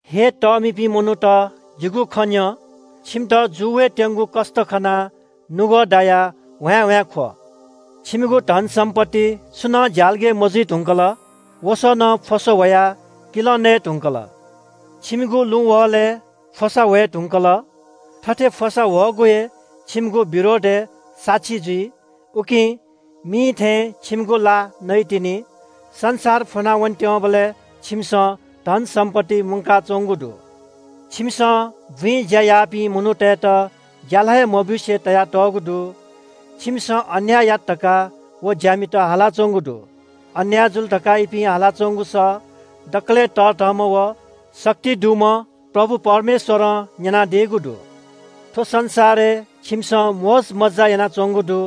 हे तःमिपिं मनूत, जिगु खँ न्‍यँ – छिमित जू वयेत्‍यंगु कष्‍ट खनाः नुगः दायाः ह्वाँय्‌ह्वाँय् ख्‍व। छिमिगु धनसम्‍पत्ति छुनं ज्‍यालगय् मजुइ धुंकल। वसः नं फ्‍वसा ह्वयाः किलं नयेधुंकल। छिमिगु लुँ वहलय् फ्‍वसा ह्वये धुंकल। थथे फ्‍वसा ह्वःगु हे छिमिगु विरोधय् साक्षी जुइ। उकिं मिं थें छिमिगु ला नइतिनि। संसार फुनावने त्‍यंबलय् छिमिसं धनसम्‍पत्ति मुंकाच्‍वंगु दु। छिमिसं बुँइ ज्‍या याःपिं मनूतय्‌त ज्‍याला हे मब्‍यूसे तयातःगु दु। छिमिसं अन्‍याय यात धकाः व ज्‍यामित हालाच्‍वंगु दु। अन्‍याय जुल धकाः इपिं हालाच्‍वंगु सः दकलय् तःधंम्‍ह व शक्ति दुम्‍ह प्रभु परमेश्‍वरं न्‍यनादीगु दु। थ्‍व संसारय् छिमिसं मोजमज्‍जा यानाच्‍वंगु दु।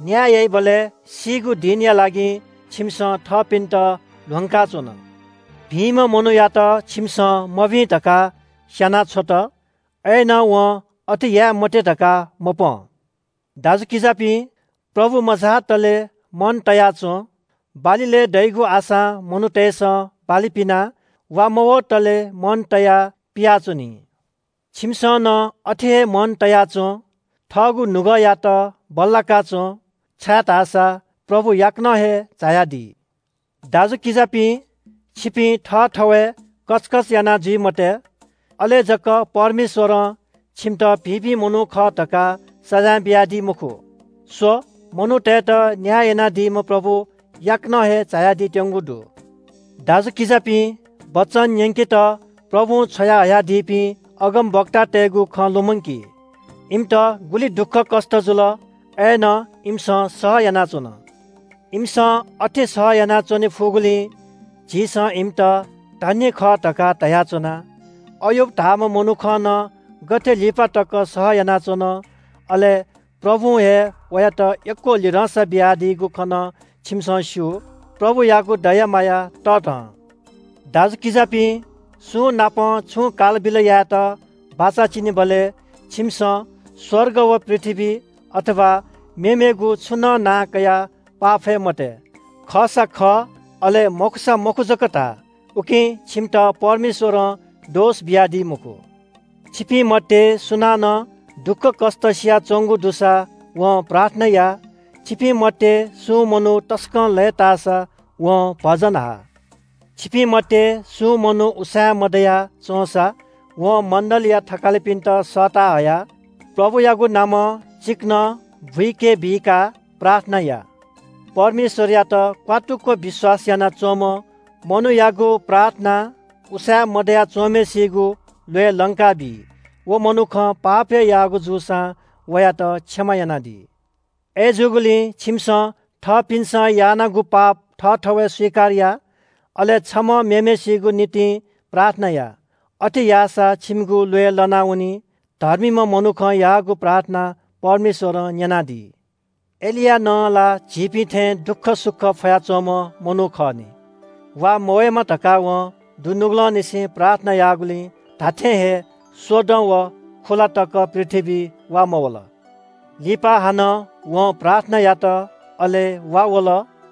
न्‍याय याइबलय् सीगु दिनया लागि छिमिसं थःपिन्‍त ल्‍ह्वंका च्‍वन। भिंम्‍ह मनूयात छिमिसं मभिं धकाः स्‍याना छ्वत, अय्‌नं वं अथे याये मते धकाः मपं। दाजुकिजापिं, प्रभु मझातले मन तया च्‍वँ। बाली लये दइगु आशां मनूतय्‌सं बाली पिनाः वा मवतले मन तयाः पियाच्‍वनी। छिमिसं नं अथे हे मन तया च्‍वँ, थःगु नुगःयात बल्‍लाका च्‍वँ छाय्‌धाःसा प्रभु याकनं हे झायादी। दाजुकिजापिं, छिपिं थःथवय् कचकच याना जुइ मते। अले जक परमेश्‍वरं छिमित भिंपिं मनूत खः धकाः सजाँय बियादी मखु। स्‍व, मनूतय्‌त न्‍याय यानादीम्‍ह प्रभु याकनं हे झायादीत्‍यंगु दु। दाजुकिजापिं, वचन न्‍यंकेत प्रभुं छ्वयाहयादीपिं अगमवक्तातय्‌गु खँ लुमंकी। इमित गुलि दुःखकष्‍ट जुल, अय्‌नं इमिसं सह यानाच्‍वन। इमिसं अथे सहयाना च्‍वने फुगुलिं झीसं इमित “धन्‍य खः” धकाः धयाच्‍वना। अय्‍यूब धाःम्‍ह मनुखं नं गथे लिपा तक सह यानाच्‍वन, अले प्रभुं हे वयात यक्‍व लिधंसा बियादीगु खँ नं छिमिसं स्‍यू। प्रभुयागु दया माया तःधं। दाजुकिजापिं, सुंनाप छुं कालबिल यायेत बाचा चिनेबलय् छिमिसं स्‍वर्ग व पृथ्‍वी, अथवा मेमेगु छुं नं नां कयाः पाफये मते। खःसा खः, अले मखुसा मखु जक धा। उकिं छिमित परमेश्‍वरं दोष बियादी मखु। छिपिं मध्‍ये सुनानं दुःखकष्‍ट सियाच्‍वंगु दुसा वं प्रार्थना या। छिपिं मध्‍ये सुं मनू तसकं लय्‌ताःसा वं भजन हा। छिपिं मध्‍ये सुं मनू उसाँय् मदयाच्‍वंसा वं मण्‍डलीया थकालिपिन्‍त सःता हयाः प्रभुयागु नामं चिकनं बुके बिकाः प्रार्थना या। परमेश्‍वरयात क्‍वात्तुक विश्‍वास यानाच्‍वंम्‍ह मनूयागु प्रार्थनां उसाँय् मदया च्‍वंम्‍हय्‌सिगु ल्‍वय् लंकाबी। व मनुखं पाप हे याःगु जूसां वयात क्षमा यानादी। अय्‌जूगुलिं छिमिसं थःपिन्‍सं यानागु पाप थःथवय् स्‍वीकार या, अले छम्‍हं मेम्‍हय्‌सिगु निंतिं प्रार्थना या। अथे याःसा छिमिगु ल्‍वय् लनावनी। धर्मीम्‍ह मनुखं याःगु प्रार्थना परमेश्‍वरं न्‍यनादी। एलिया नं ला झीपिं थें दुःखसुख फयाच्‍वंम्‍ह मनू खः नि। वा मवयेमा धकाः वं दुनुगलंनिसें प्रार्थना याःगुलिं धात्‍थें हे स्‍वदँ व खुलातक पृथ्‍वीइ वा मवल। लिपा हानं वं प्रार्थना यात, अले वा वल,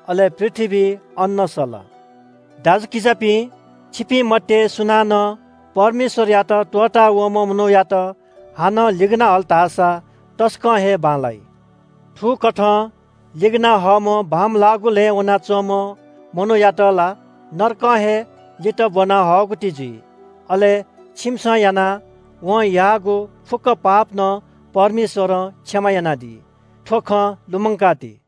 अले पृथ्‍वीइ अन्‍न सल। दाजुकिजापिं, छिपिं मध्‍ये सुनानं परमेश्‍वरयात त्‍वःता वंम्‍ह मनूयात हानं लिगना हल धाःसा तसकं हे बांलाइ। थुकथं लिगना हःम्‍ह बांमलाःगु लँय् वनाच्‍वंम्‍ह मनूयात ला नरकं हे लित ब्‍वना हःगुति जुइ। अले छिमिसं यानाः वं याःगु फुक्‍क पाप नं परमेश्‍वरं क्षमा यानादी। थ्‍व खँ लुमंका ति।